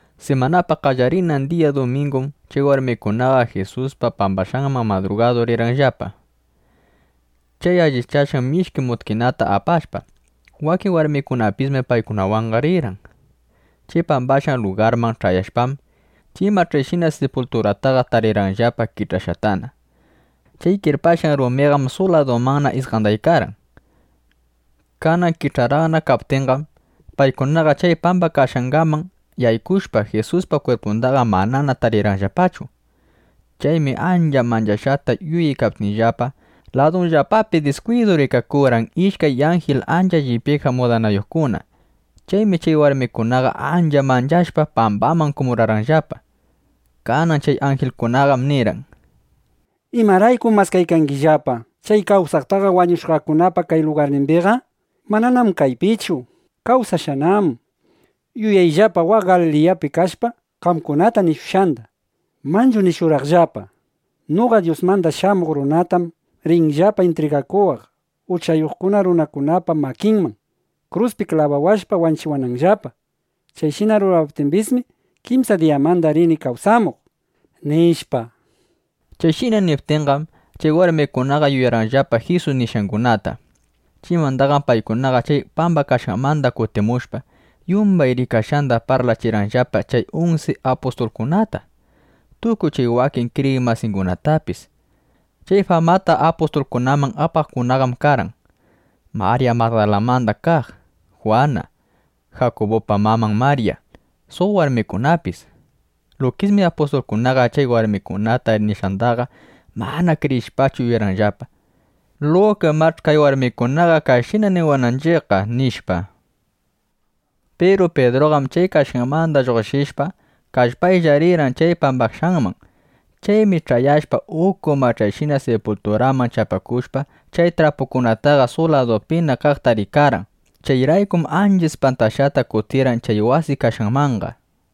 Simanapa qallarinan diya dumingum chay warmikunaqa Jisusta pambashqanman madrugadu rirqanllapa, chay allichashqan mishki mutkinata apashpa. Wakin warmikunapismi paykunawanqa rirqan. Chay pambashqan lugarman ch'ayashpam, chay mach'ayshina sipulturataqa tarirqanllapa kich'ashqatana. Chay kirpashqan rumiqam suq ladumanna isqandaykarqan. Kanan kich'araqna kaptinqam, paykunaqa chay pambakashqanman yaykushpa, Jisuspa kwirpundaqa manana tarirqanllapachu. Chaymi ancha manchashqata yuyaykaptinllapa, ladunllapapi diskwidu rikakurqan ishkay anjil ancha llipyaykaq mudanayuqkuna. Chaymi chay warmikunaqa ancha manchashpa, pambaman kumurarqanllapa. Kanan chay anjilkunaqam nirqan: —¿Imaraykum maskaykangillapa chay kawsaqtaqa wañushqakunapa kay lugarnimbiqa? Mananam kaypichu. Kawsashqanám. Yuyayllapa waq Galiliyapi kashpa, qamkunata nishushqanda. Manchu nishurqanllapa: “Noqa Dyusmanda Shamuq Runatam rinllapa intrigakuwaq uchayuq runakunapa makinman, kruspi klabawashpa wanchiwananllapa. Chayshina rurawaptimbismi, kimsa diyamanqa rini kawsamuq”, nishpa. Chayshina niptinqam, chay warmikunaqa yuyarqanllapa Jisus nishqangunata. Chaymandaqam paykunaqa chay pambakashqanmanda kutimushpa, yumbay rikashqanda parlachirqanllapa chay unsi apustulkunata, tukuy chay wakin kriyiq masingunatapis. Chay famata apustulkunaman apaqkunaqam karqan: Marya Magdalamanda kaq, Jwana, Jakubupa maman Marya, suq warmikunapis. Lukismi apustulkunaqa chay warmikuna nishqandaqa mana kriyishpachu yuyarqanllapa: Luka imach'i kay warmikunaqa kayshina niwananchiqqa, nishpa. Piru Pidruqam chay kashqanmanda lluqshishpa, kallpaylla rirqan chay pambashqanman. Chaymi ch'ayashpa, uku mach'ayshina sipulturaman chapakushpa, chay trapukunataqa suq ladupina kaqta rikarqan. Chayraykum ancha ispantashqata kutirqan chay wasi kashqanmanqa.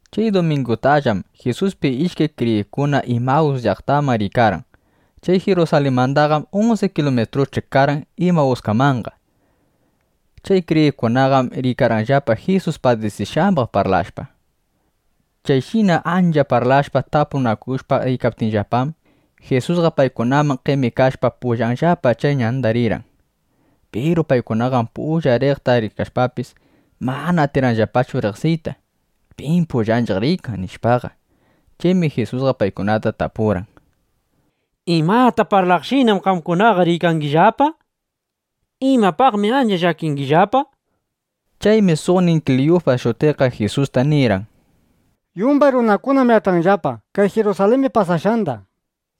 Chay dumingutallam Jisuspi ishkay kriyiqkuna Imawus llaqtaman riykarqan. Chay Jirusalinmandaqam unsi kilumitrusch'i karqan Imawuskamanqa. Chay kriyiqkunaqam riykarqanllapa Jisus padisishqambaq parlashpa. Chayshina ancha parlashpa, tapunakushpa riykaptinllapam, Jisusqa paykunaman qemikashpa, pullanllapa chay ñanda rirqan. Piru paykunaqam pullan riqta rikashpapis, mana atirqanllapachu riqsiyta, pim pullanchiq riykan, nishpaqa. Chaymi Jisusqa paykunata tapurqan: —¿Imata parlaqshinam qamkunaqa riykangillapa? ¿Imapaqmi ancha llakingillapa? nishpa. Chaymi suqnin Kliyufas shutiqqa Jisusta nirqan: —Yumbay runakunam yach'anllapa kay Jirusalimbi pasashqanda.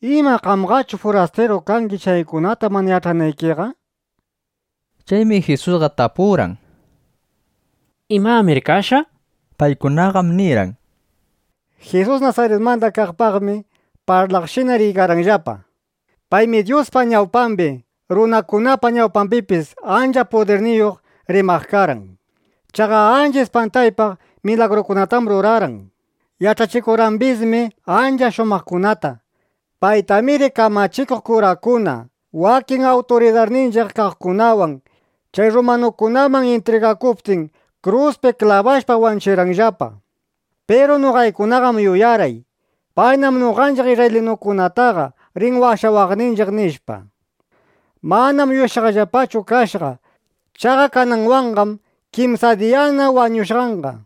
¿Ima qamqachu furastiru kangi, chaykunata mana yach'anaykiqa? nishpa. Chaymi Jisusqa tapurqan: —¿Imamir kashqa? nishpa. Paykunaqam nirqan: —Jisus Nasaritmanda kaqpaqmi parlaqshina riykanillapa. Paymi Dyuspa ñawpambi, runakunapa ñawpambipis ancha pudirniyuq rimaq karqan. Chaqa ancha ispantaypaq milagrukunatam rurarqan. Yach'achikurqambismi ancha shumaqkunata. Paytamiri kamachikuq kurakuna, wakin awturidarninchiq kaqkunawan chay rrumanukunaman intrigakuptin, kruspi klabashpa wanchirqanllapa. Piru noqaykunaqam yuyarqay: Paynam noqanchiq isrraylinukunataqa rin washawaqninchiq, nishpa. Manam yuyashqayllapachu kashqa. Chaqa kananwanqam kimsa diyana wañushqanqa.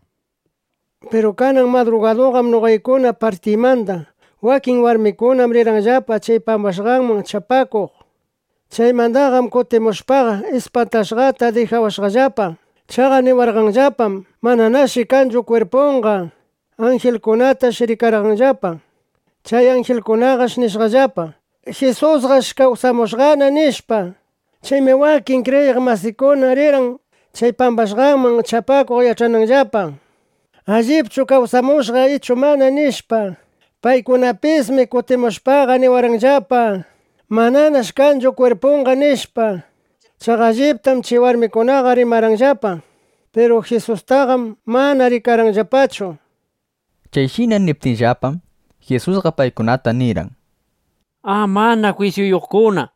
Piru kanan madrugadum noqaykuna partiymanda wakin warmikuna rirqanllapa chay pambashqanman chapakuq. Chaymandaqam kutimushpaqa, ispantashqata dijawashqallapa. Chaqa niwarqanllapam, mananash kanchu kwirpunqa. Anjilkunatash rikarqanllapa. Chay anjilkunash nishqallapa: “Jisusqam kawsamushqana”, nishpa. Chaymi wakin kriyiq masiykuna rirqan chay pambashqanman chapakuq, yach'ananllapa: Allipchu kawsamushqa ichu mana, nishpa. Paykunapismi kutimushpaqa niwarqanllapa: “Mananash kanchu kwirpunqa”, nishpa. Chaqa alliptam chay warmikunaqa rimarqanllapa. Piru Jisustaqam mana rikarqanllapachu. Chayshina niptinllapam, Jisusqa paykunata nirqan: —¡A, mana jwisyuyuqkuna!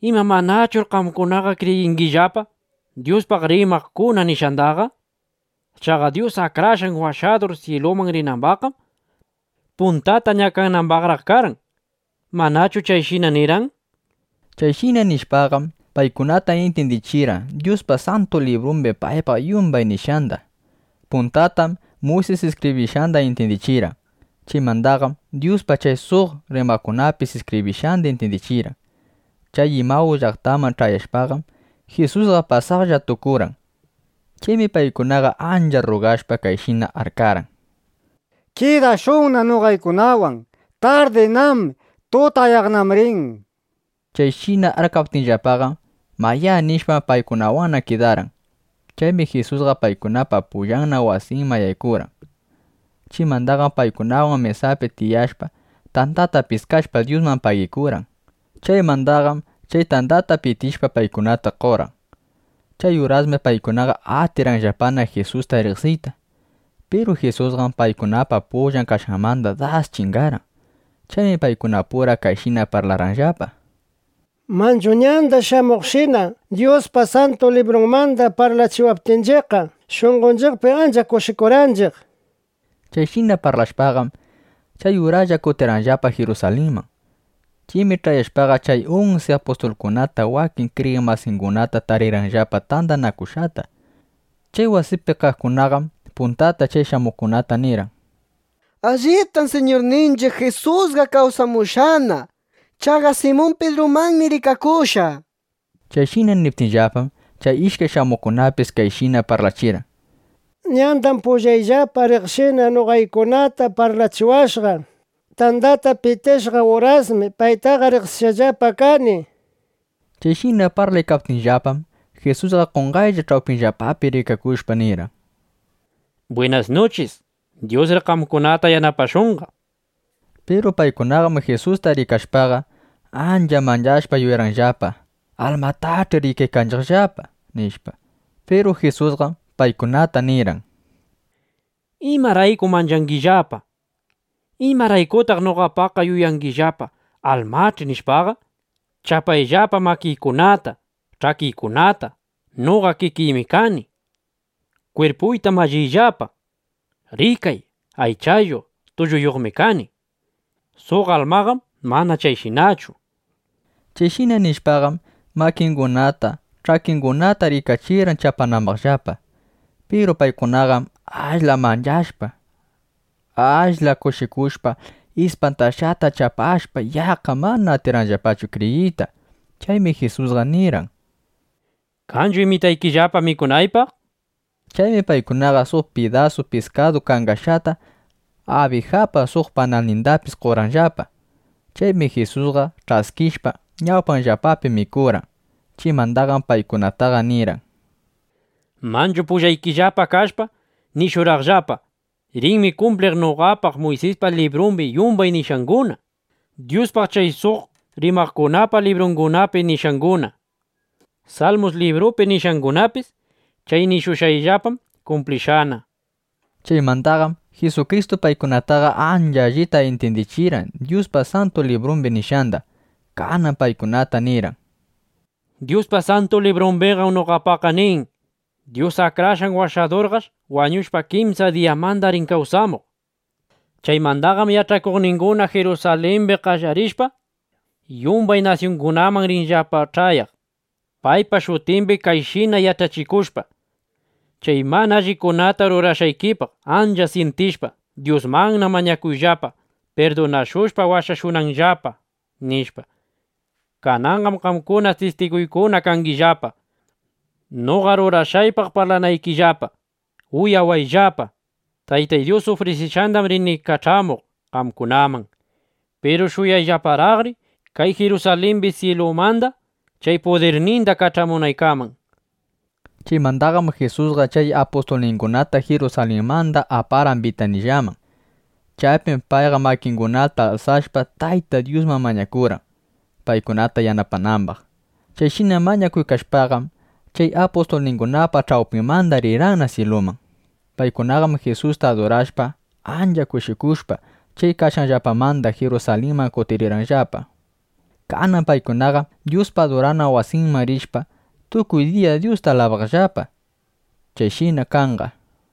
¿Ima manallachur qamkunaqa kriyingillapa Dyuspaq rimaqkuna nishqandaqa? Chaqa Dyus Akrashqan Washadur syiluman rinambaqqam, puntata ñakanambaqraq karqan. ¿Manachu chayshina nirqan? nishpa. Chayshina nishpaqam, paykunata intyindichirqan Dyuspa Santu Librumbi paypaq yumbay nishqanda. Puntatam Muysis iskibrishqanda intyindichirqan. Chaymandaqam Dyuspaq chay suq rimaqkunapis iskibrishqanda intyindichirqan. Chay Imawus llaqtaman ch'ayashpaqam, Jisusqa pasaqlla tukurqan. Chaymi paykunaqa ancha rrugashpa, kayshina arkarqan: —Kidashunna noqaykunawan. Tardinám. Tutayaqnam rin, nishpa. Chayshina arkaptinllapaqam, “Mayá” nishpa, paykunawanna kidarqan. Chaymi Jisusqa paykunapa pullanna wasinman yaykurqan. Chaymandaqam paykunawan mesapi tiyashpa, tandata piskashpa, Dyusta pagikurqan. Chaymandaqam chay tandata pitishpa, paykunata qorqan. Chay urasmi paykunaqa atirqanllapana Jisusta riqsiyta. Piru Jisusqam paykunapa pullan kashqanmanda das chingarqan. Chaymi paykunapura kayshina parlarqanllapa: —Manchu ñanda shamuqshina Dyuspa Santu Librunmanda parlachiwaptinchiqqa, shunqonchiqpi ancha kushikurqanchiq, nishpa. Chayshina parlashpaqam, chay uraslla kutirqanllapa Jirusalinman. Chaymi ch'ayashpaqa, chay unsi apustulkunata wakin kriyiq masingunata tarirqanllapa tandanakushqata. Chay wasipi kaqkunaqam puntata chay shamuqkunata nirqan: —Alliptam Siñurninchiq Jisusqa kawsamushqana. Chaqa Simun Pidrumanmi rikakushqa, nishpa. Chayshina niptinllapam, chay ishkay shamuqkunapis kayshina parlachirqan: —Ñandam pullayllapa riqshina noqaykunata parlachiwashqa. Tandata pitishqan urasmi paytaqa riqsishqallapa kani, nishpa. Chayshina parlaykaptinllapam, Jisusqa qonqaylla ch'awpinllapapi rikakushpa, nirqan: —Bwinas nuchis, Dyusri qamkunata yanapashunqa, nishpa. Piru paykunaqam Jisusta rikashpaqa, ancha manchashpa, yuyarqanllapa: Almatach'i rikaykanchiqllapa, nishpa. Piru Jisusqam paykunata nirqan: —¿Imaraykum manchangillapa? ¿Imaraykutaq noqapaqqa yuyangillapa, almach'i, nishpaqa? Chapayllapa makiykunata, ch'akiykunata. Noqa kikiymi kani. Kwirpuyta malliyllapa. Rikay, aychayuq, tulluyuqmi kani. Suq almaqam mana chayshinachu, nishpa. Chayshina nishpaqam, makingunata, ch'akingunata rikachirqan chapanambaqllapa. Piru paykunaqam ashla manchashpa, ashla kushikushpa, ispantashqata chapashpa, yaqqa mana atirqanllapachu kriyiyta. Chaymi Jisusqa nirqan: —¿Kanchu imitaykillapa mikunaypaq? nishpa. Chaymi paykunaqa suq pidasu piskadu kangashqata, abijapa suq panalnindapis qorqanllapa. Chaymi Jisusqa ch'askishpa, ñawpanllapapi mikurqan. Chaymandaqam paykunata nirqan: —Manchu pullaykillapa kashpa, nishurqaqllapa: “Rinmi kumpliq noqapaq Muysispa librumbi yumbay nishqanguna, Dyuspaq chay suq rimaqkunapa librungunapi nishqanguna, Salmus librupi nishqangunapis”, nishpa. Chay nishushqayllapam kumplishqana. Chaymandaqam Jisukristu paykunataqa ancha allita intyindichirqan Dyuspa Santu Librumbi nishqanda. Kanan paykunata nirqan: —Dyuspa Santu Librumbiqam noqapaqqa nin: Dyus Akrashqan Washadurqash wañushpa, kimsa diyamanda rin kawsamuq. Chaymandaqam yach'akuqninguna Jirusalimbi qallarishpa, yumbay nasyungunaman rinllapa ch'ayaq, paypa shutimbi kayshina yach'achikushpa: “Chay mana allikunata rurashqaykipaq ancha syintishpa, Dyusmanna mañakuyllapa, pirdunashushpa, washashunanllapa”, nishpa. Kananqam qamkuna tistiguykuna kangillapa, noqa rurashqaypaq parlanaykillapa. Uyawayllapa, Taytay Dyus ufrisishushqandam rini kach'amuq qamkunamanqa. Piru shuyayllaparaqri kay Jirusalimbi, syilumanda chay pudirninda kach'amunaykaman, nishpa. Chaymandaqam Jisusqa chay apustulningunata Jirusalinmanda aparqan Bitanillaman (Bitaniyaman). Chaypim payqa makingunata alsashpa, Tayta Dyusman mañakurqan, paykunata yanapanambaq. Chayshina mañakuykashpaqam, chay apustulningunapa ch'awpinmanda rirqanna syiluman. Paykunaqam Jisusta adurashpa, ancha kushikushpa, chay kashqanllapamanda Jirusalinman kutirqanllapa. Kanan paykunaqam Dyuspa adurana wasinman rishpa, tukuy diya Dyusta alabaqllapa. Chayshina kanqa.